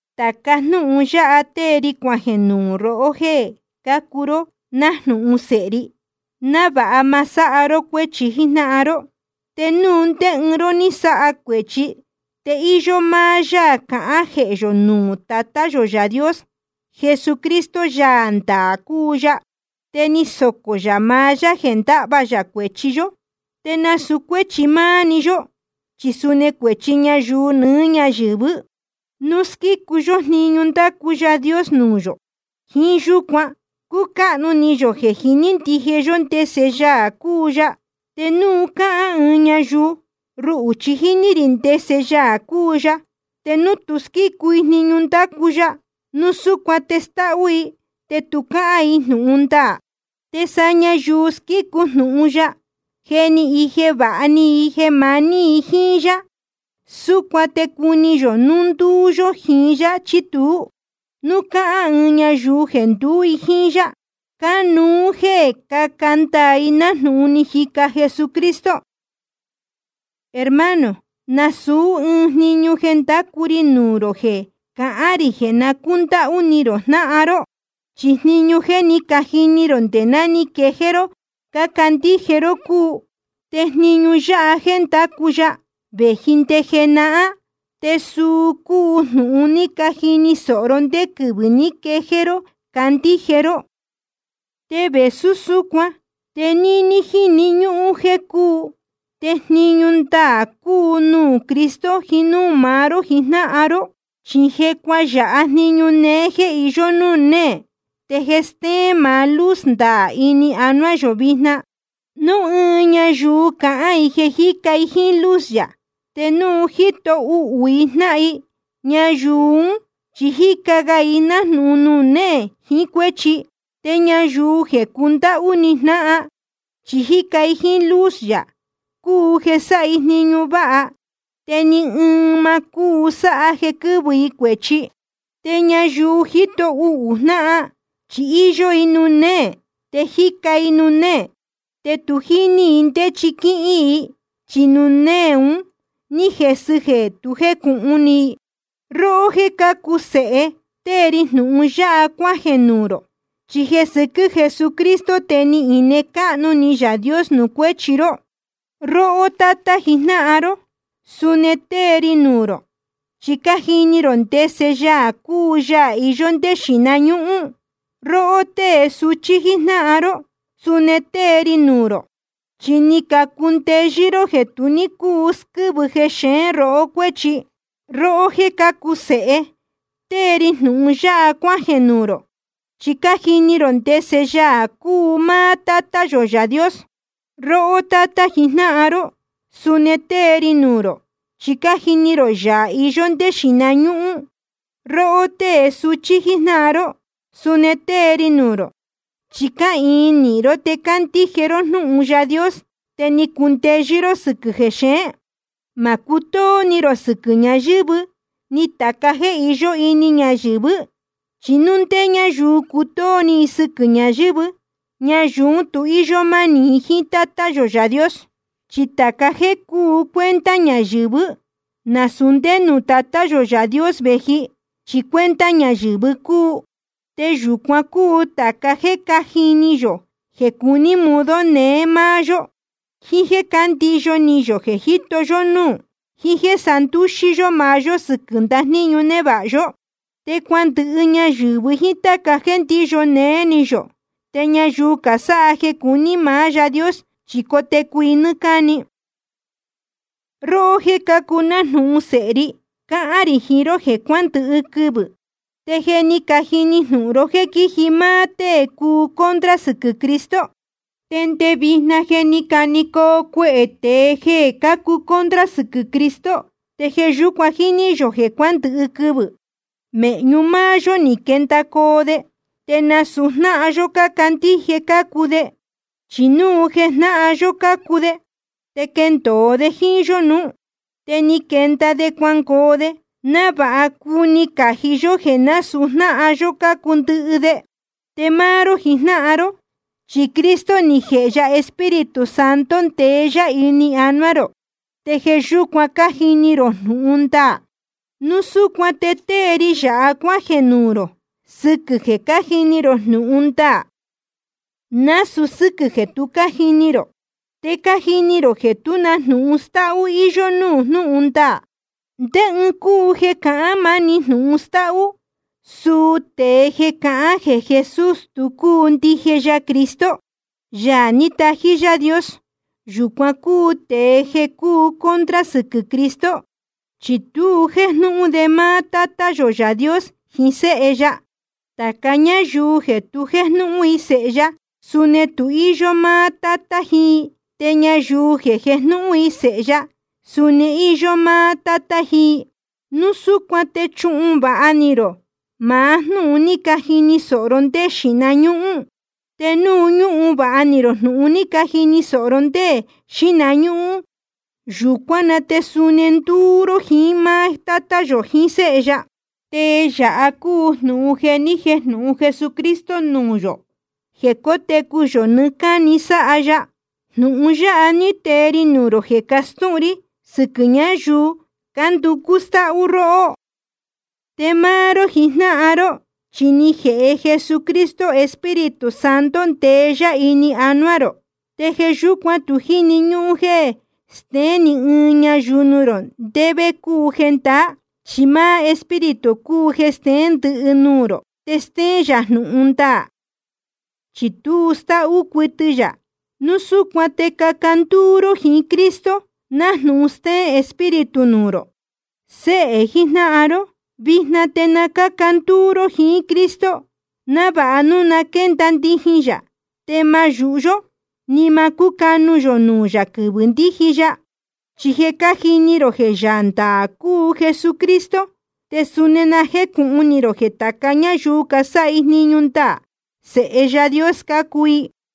Tāca jnúhun yáha tée ri cuajeē nuū rohó jéē cácuu ró nájnūhun sēhe ri, návāha ma sáha ró cuéchi jíjnáhan ró. Te núu ndé ɨɨn ró ní sáha cuēchi, te íyó máá Yaā cahán jehē yō nuū maá Tátá yō Yaā Dios. Jesucristo Yaā ndaā cúu ya. Te ni socō yā maá yá jeē ndahva yā cuēchi yó, te nasūu cuéchi máá‑ni yó, chi suni cuēchi ñayuu nɨɨ́ ñáyɨ̄vɨ́. Núu squícu yó jniñu ndácu Yaā Dios nuū yō, jíín yúcuan cúcáhnu ni yō jeē jiní ndije yó ndese Yaā cúu ya. Te núu cáhán ɨɨn ñayuu: Ruhū chi jíní rī ndese Yaā cúu ya, te núu tu squícu i jniñu ndácu ya, núu súcuan te stáhú i, te tu cáhán i jnūhun ndaā. Te sa ñayuu squícu jnūhun ya, je ni ije vāha ni i jeē maní i jíín yá. Súcuan te cuni yō núu ndúú yó jiín yá chí tuú. Núu cáhán ɨɨn ñayuu jeē nduú i jíín yá, cánuú jéē caca ndaā i nájnūhun ni jica Jesucristo. Hermano, nasūú ɨɨn jniñu jéé ndácu ri nuū rō jeē cahán rī jeē na cúndáhú ni rō jnáhan ró. Chi jniñu jeē je cájini rō nde ná ni quejéé ró candíje ró cúu. Te jniñu yáha jeē ndácu ya, vēji nde jenahán, te suu cúu jnūhun ni cajini sōho ró ndé quɨvɨ̄ ní quejéé ró candíje ró. Te vēsú súcuan, te níní jniñu jéé cúu, te jniñu ndaā cúu nuū Cristo jiín núū maá ró jijnáhan ró. Chi je cuayāha jniñu néé jéē iyó núū néē, te je stéén maá luz ndaā ini anuá yō vijna. Núu ɨɨn ñayuu cahán i jeē jíca i jíín luz yā, te núu jíto uhū i jnáhan i, ñayuu ún chi jíca ga i nájnūhun nuū néē jiín cuéchi. Te ñayuu jeē cundáhú ni jnáhan, chi jíca i jíín luz yā, cúu jeē sáha i jniñu váha. Te ni ɨɨn ma cúu sáha jeē quɨ́vɨ i cuēchi. Te ñayuu jíto uhū jnáhan, chi íyó i nuū néē, te jíca i nuū néē. Te tu jíní i ndé chi quíhín i, chi nuū néē un ní jesɨ jeē tu jécūhun ni i. Róhó jéē cácuu sēhe, tée ri jnūhun yáha cuájeē nuū rō, chi jeē sɨquɨ́ Jesucristo te ni ine cáhnu ni Yaā Dios nuū cuéchi ró. Róhó tátá jijnáhan ró, suni tée ri nuū rō, chi cájini rō ndese Yaā cúu Yaā iyó ndé xīhna ñúhún. Róhó tée suchí jíjnáhan ró, suni tée ri nuū rō, chi ni cacundeyɨ́ ró jeē tu ní cúu squɨ́vɨ jexeén rohó cuéchi. Róhó jéē cácuu sēhe, tée ri jnūhun yáha cuájeē nuū rō, chi cájini rō ndese Yaā cúu máá Tátá yō Yaā Dios. Róhó tátá jijnáhan ró, suni tée ri nuū rō, chi cájini rō Yaā iyó ndé xīhna ñúhún. Róhó tée suchí jíjnáhan ró, suni tée ri nuū rō, chi cáhīin nīhin ró, te cácandíje ró jnúhun Yaā Dios, te ni cacundeyɨ́ ró sɨ́quɨ̄ jéxeén. Ma cutóó ni rō sɨquɨ̄ ñayɨ̄vɨ́, ni tāca jéē iyó ini ñayɨ̄vɨ́. Chi núu ndé ñáyuu cutóó ni i sɨquɨ̄ ñayɨ̄vɨ́, ñayuu ún tu íyó mánī i jíín Tátá yō Yaā Dios. Chi tāca jéē cúu cuenta ñayɨ̄vɨ́, nasūu ndé nuū Tatá yō Yaā Dios vēji, chi cuenta ñayɨ̄vɨ cúu. Te yūcuan cúu tāca jéē cájni ni yō jeē cuní modo neé máá yó, jíín jéē ndíyo ni yō jeē jíto yó núū, jiín jéē sandúxí yó maá yó sɨquɨ̄ ndajníñu névāha yó. Te cuandɨhɨ ñayɨ̄vɨ jíín táca jéē ndíyo néé ni yō. Te ñayuu casáha jeē cuní maá Yaā Dios, chi cotecu i nɨ́ɨ́ cáni. Róhó jéē cácuu nájnūhun sēhe ri, cáhán rī jiín ró jeē cuandɨhɨ quɨvɨ̄. Te je ni cajini jnūhun ró jéē quíji máá tée cuu contra sɨquɨ̄ Cristo. Te nde vijna je ni canecoo cuehē tēe jeē cácuu contra sɨquɨ̄ Cristo. Te jeē yúcuan jíní yō jeē cuándɨhɨ quɨvɨ̄. Mēhñu máá yó ni quendacoo de, te nasūu jnáhan yó cácandíje cácuu de. Chi núu jeē jnáhan yó cácuu de, te quendōo de jíín yó nuú. Te ni quenda de cuangoo de, návāha cuni cají yó jéē násūu jnáhan yó cácuu ndɨhɨ de. Te máá ró jijnáhan ró, chi Cristo ni jēhe ya Espíritu Santo, ndeé yá ini anuá rō, te jeē yúcuan cájini rō jnūhun ndaā. Núu súcuan te tée ri yāha cuájeē nuū rō, sɨquɨ̄ jeē cájini rō jnūhun ndaā, nasūu sɨ́quɨ̄ jeē tu cájini rō. Te cájini rō jeē tú na jnūhun stáhú íyó nuū jnúhun ndaā. ¿Ndé ɨɨn cúu jeē cahán máni jnūhun stáhú? Suu tēe jeē cahán jeē Jesús, tu cúu ndije ya Cristo, Yaā ní tají Yaā Dios. Yūcuan cúu tēe jeē cúu contra sɨquɨ̄ Cristo, chi tu jéjnúhún de máá Tátá yō Yaā Dios jiín Séhe ya. Tāca ñáyuu jeē tu jéjnúhún i Sēhe ya, suni tu íyó máá Tátá jiín i. Te ñayuu jeē jejnúhún i Sēhe ya, suni íyó máá Tátá jiín i. Núu súcuan te chuhun vāha ni rō maá jnúhun ni cajini sōho ró ndé jeē xíhna ñúhún. Te núu ñúhun vāha ni rō jnūhun ní cajini sōho ró ndé jeē xíhna ñúhún, yūcuán na te suni ndúú ró jiín máá Tátá yō jiín Séhe ya. Te yāha cúu jnūhun jeē ni jéjnūhun Jesucristo nuū yō: jeē cótecu yō nɨɨ́ cáni sáha ya. Jnūhun yáha ní tee ri nuū rō jeē cástūhun rí sɨquɨ̄ ñáyuu cánducú stáhú róhó. Te máá ró jijnáhan ró, chi ni jēhe Jesucristo Espíritu Santo, ndeé yá ini anuá rō. Te jeē yúcuan tu jíni ñúhún jéē steén ni ɨɨn ñayuu nuū rō ndé vé cúu jendaá, chi máá Espíritu cúu jeē steén ndɨhɨ nuū rō, te stéén yā jnūhun ndaā, chi tu stáhú cuɨtɨ yā. Núu súcuan te caca ndúú ró jiín Cristo, nájnūhun stéén Espíritu nuū rō. Séhē jijnáhan ró, vijna te na cáca ndúú ró jiín Cristo, návāha núu na quénda ndijin yā, te ma yūhu yó, ni ma cúcanu yō nuū yā quɨvɨ̄ ndíji ya. Chi je cájini rō jeē Yaā ndaā cúu Jesucristo, te suni na jécūhun ni rō jeē tāca ñáyuu casáha jniñu ndaā, sēhe Yaā Dios cácuu i.